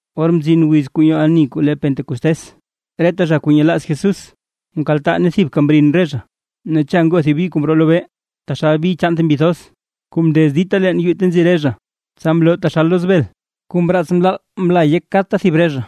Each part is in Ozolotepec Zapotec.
Or mzin wiz kuu nyoo ani kuu le Pentecostés, reta zha kuu nyelaaz Jesús mkaltaa ne thibka mrin re zha. Ne cha ngoo thib bi kuu mroo lobee, taxal bi chaan thib mbi thoz, kuu mndez dita leen yuu ta nzi re zha. Tsa mloo taxal loz bel, kuu mraats mlaal mla yek kadta thib re zha.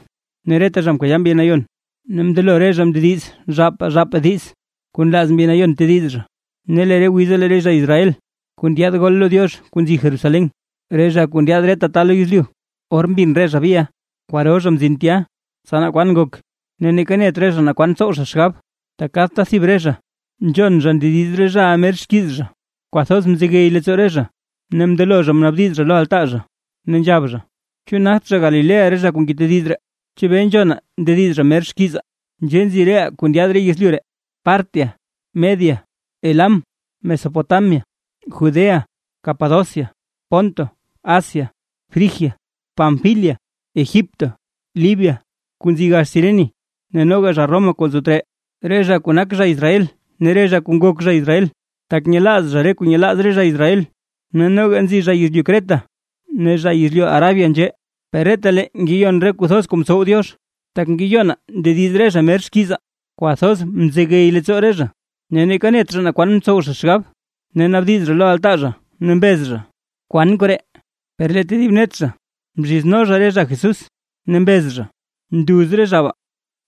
Ne reta zha mkayaa Mbi Nayon, ne mndelo re zha mndediz zhaapaa zhaapaa diiz, kuu nlaaz Mbi Nayon tediz zha. Ne re wiza lee re zha Israel kuu ndyaad gol lo Diox kuu nzi Jerusalén, re zha kuu ndyaad reta ta lo yezlyu. Or mbin re zha biʼa, kwaro zha mzin tya tsa naa kwan ngok, ne neeka net re zha naa kwan tsow zha xgab, tak kadta thib re zha nzhon zha ndediz re zhaʼa mer xkiiz zha. Kwathoz mzegey leettsoo re zha, ne mndelo zha mnaabdiz zha lo altaa zha, ne nzhab zha: ―¿Chu nagt zha Galilea re zha kuu ngetediz ree? ¿Chebee nzhonaa ndediz zha mer xkiizaa? Nzhee nzi reʼaa kuu ndyaad re yezlyu ree, Partia, Media, Elam, Mesopotamia, Judea, Capadocia, Ponto, Asia, Frigia, Panfilia, Egipto, Libia kuu nzi gax Cirene ne noga zha Roma kuu nzo tree. Re zha kuu nak zha Israel ne re zha kuu ngok zha Israel, tak nyelaaz zha re kuu nyelaaz re zha Israel. Ne noga nzi zha yezlyu Creta ne zha yezlyu Arabia nzhee. Per retalee ngeyon re kuu thoz kuu ntsow Diox, tak ngeyonaa ndediz re zha mer xkiizaa. Kwathoz mzegey leettsoo re zha, ne neeka net zha naa kwan tsow zha xgab, ne naabdiz zha lo altaa zha, ne mbez zha: ―¿Kwan koree? Per lee tedib net zha mzhizno zha re zha Jesús, ne mbez zha: ―¡Nduz re zha baa!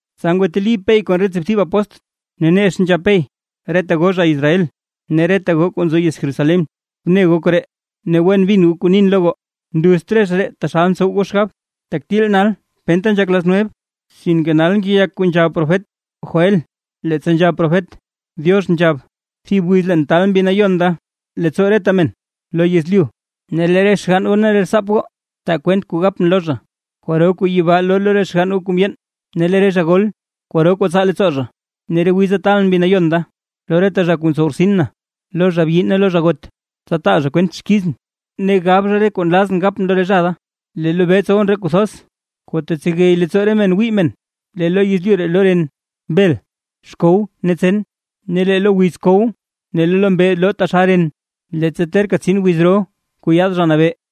Tsa ngwateli Pey kon re tsiibthib apóstl, ne nex nzhab Pey: ―Reta goo zha Israel, ne reta goo kuu nzo yez Jerusalén. Bne goo koree, ne wen bin goo kuu nin lo goo. Nduzt re zha ree taxal ntsow goo xgab, tak til nal penta nzhak las nueve. Sinke nal ngeyak kuu nzhab profet Joél, leettsa nzhab profet: Diox nzhab: “Thib wiz leen taal Mbi Nayon da leettsoo reta men lo yezlyu. Ne lee re xgann goo ne re rtsaap goo, taa kwent kuu gapʼn lo zha, kwaro kuu yibaa loo lo re xgann goo kuu mndyeen, ne lee re zha gol kwaro kuu tsaa leettsoo zha. Ne re wiza taalʼn Mbi Nayon da lo reta zha kuu ntsow rtsin na, lo zha byi ne lo zha got, tsa taa zha kwent xkizʼn, ne gab zha re kuu nlazʼn gapʼn lo re zha da. Lee lobee tsowʼn re kuu thoz, kuu tetsegey leettsoo re men wii men, lee lo yezlyu loo ren, bel, xkow ne tsen. Lee lo wiz kow ne lee lo mbee loo taxal ren, leettsa terka tsin wiz ro kuu yaad Zha Nabee.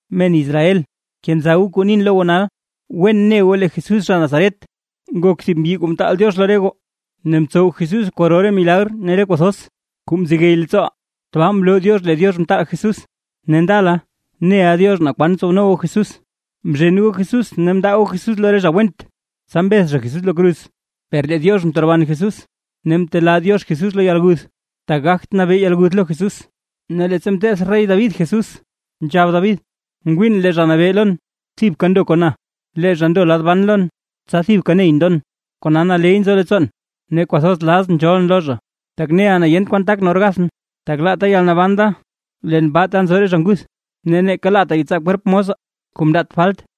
’Men Israel, kenza goo kuu nin lo goo nal, wen ne goo lee Jesús zha Nazaret, nak thib mbyi kuu mtaal Diox lo re goo, ne mtsow Jesús kwaro re milagr ne re kuu thoz kuu mzegey leettsooʼaa. Tbaa mloo Diox lee Diox mtaal Jesús. Ne ndala neʼa Diox naa kwan tsowno goo Jesús. Mzhen goo Jesús ne mndaa goo Jesús lo re zha went, tsa mbeth zha Jesús lo kruz. Per lee Diox mteroban Jesús, ne mtelaa Diox Jesús lo yalguth, tak gagt nabee yalguth lo Jesús. Ne leettsa mteth rey David Jesús, nzhab David: Ngwiin lee Zha Nabee lon thibka ndo kon na, lee zha ndo lad ban lon, tsa thibka ney ndon. Kona naley nzo leettsoon, ne kwathoz lazʼn nzhoolʼn lo zha. Tak neʼa na yent kwan takʼn or gathʼn, tak laata yalnaban da leen baa ta nzo re zha nguth, ne neeka laata yetsaa kwerp mosa, kuu mndaat falt.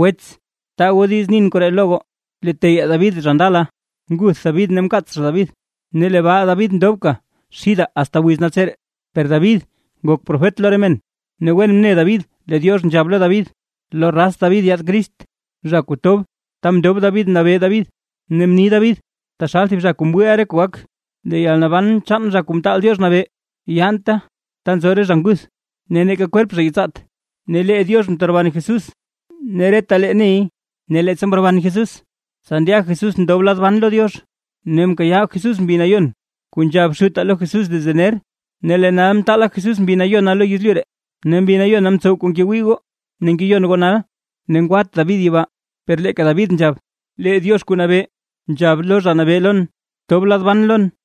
’Wets taa goo diiz nin koree lo goo. Lee teyaa David zha ndala, nguth David ne mkaats zha David, ne lee baa David ndobka xidaa asta wiz naltseree. Per David ngok profet lo re men, ne wen mne David lee Diox nzhab lo David, lo raz David yaad Crist, zha kuu tob ta mndob David mnabee David. Ne mni David taxal thib zha kuu mwiiʼa re kuu gak: Lee yalnaban chaan Zha Kuu Mtaal Diox Nabee, yaanta ta nzo re zha nguth, ne neeka kwerp zha yetsaat. Ne lee Diox mteroban Jesús ne retalee ney. Ne leettsa mroban Jesús tsa ndya Jesús ndob lad ban lo Diox, ne mkayaa Jesús Mbi Nayon kuu nzhab Xutaa lo Jesús desde ner, ne lee nal mtaala Jesús Mbi Nayona lo yezlyu ree, ne Mbi Nayona mtsow kuu ngewii goo ne ngeyon goo nal. Ne ngwat David yibaa. Per leeka David nzhab: Lee Diox Kuu Nabee, nzhab lo Zha Nabee lon: “Btob lad ban lon,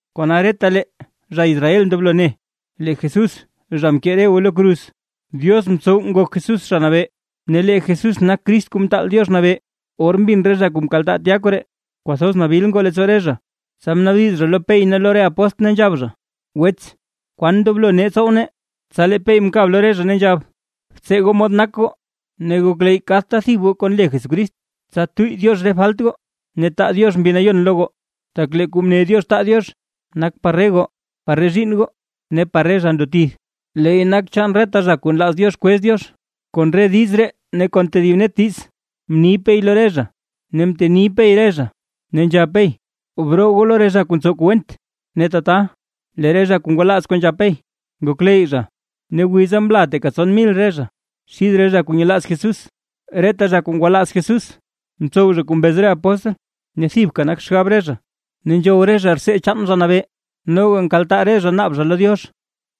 ’Kona retalee zha Israel ndoblo ne: Lee Jesús zha mkee re goo lo kruz, Diox mtsow nak Jesús Zha Nabee, ne lee Jesús nak Crist Kuu Mtaal Diox Nabee. Or mbin re zha kuu mkaltaa tya koree, kwathoz nabil ngoo leettsoo re zha, tsa mnaabdiz zha lo Pey ne lo re apóstl, ne nzhab zha: ―Wets, ¿kwan ndoblo nee tsow nee? Tsa lee Pey mkab lo re zha, ne nzhab: ―Btsee goo mod nak goo, ne gokleyy kadta thib goo kon le Jesucrist, tsa tuyy Diox re falt goo, ne taa Diox Mbi Nayon lo goo. Tak lee kuu mne Diox taa Diox nak par re goo, par re zhiinn goo ne par re zha ndo tith, leey nak chaan reta zha kuu nlaaz Diox kwez Diox. Kon re diiz ree ne kon tedib net diiz mni Pey lo re zha ne mteni Pey re zha, ne nzhab Pey: ―¡Broo goo lo re zha kuu ntsow kuu went! Ne tata, lee re zha kuu ngwalaaz kuu nzhab Pey, ngokleyy zha, ne wiza mla teeka tson mil re zha xid re zha kuu nyelaaz Jesús. Reta zha kuu ngwalaaz Jesús, ntsow zha kuu mbez re apóstl, ne thibka nak xgab re zha, ne nzhow re zha rtsee chaan Zha Nabee, noga nkaltaa re zha naab zha lo Diox.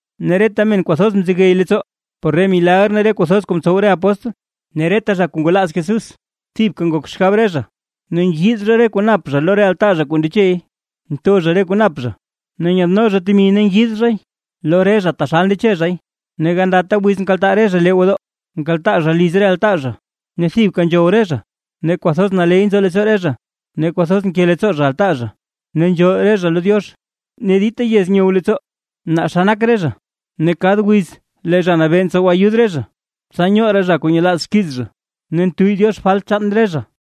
Ne reta men kwathoz mzegey leettsoo, por re milagr ne re kuu thoz kuu mtsow re apóstl. Ne reta zha kuu ngwalaaz Jesús thibka ngok xgab re zha, ne ngiid zha re kuu nap zha lo re altaa zha kuu ndechey. Ntho re zha kuu nap zha, ne nyadno zha temi ne ngiid zhay lo re zha taxalta ndeche zhay. Ne gandata wiz nkaltaa re zha lee gwodoo, nkaltaa zha liz re altaa zha ne thibka nzhow re zha, ne kwathoz naley nzo leettsoo re zha, ne kwathoz nke leettsoo zha altaa zha. Ne nzhool re zha lo Diox, ne dita yez nyow leettsoo naa xa nak re zha, ne kad wiz lee Zha Nabee ntsow ayud re zha, tsa nyoo raa zha kuu nyelaaz xkiiz zha, ne ntuyy Diox falt chaan re zhaʼa.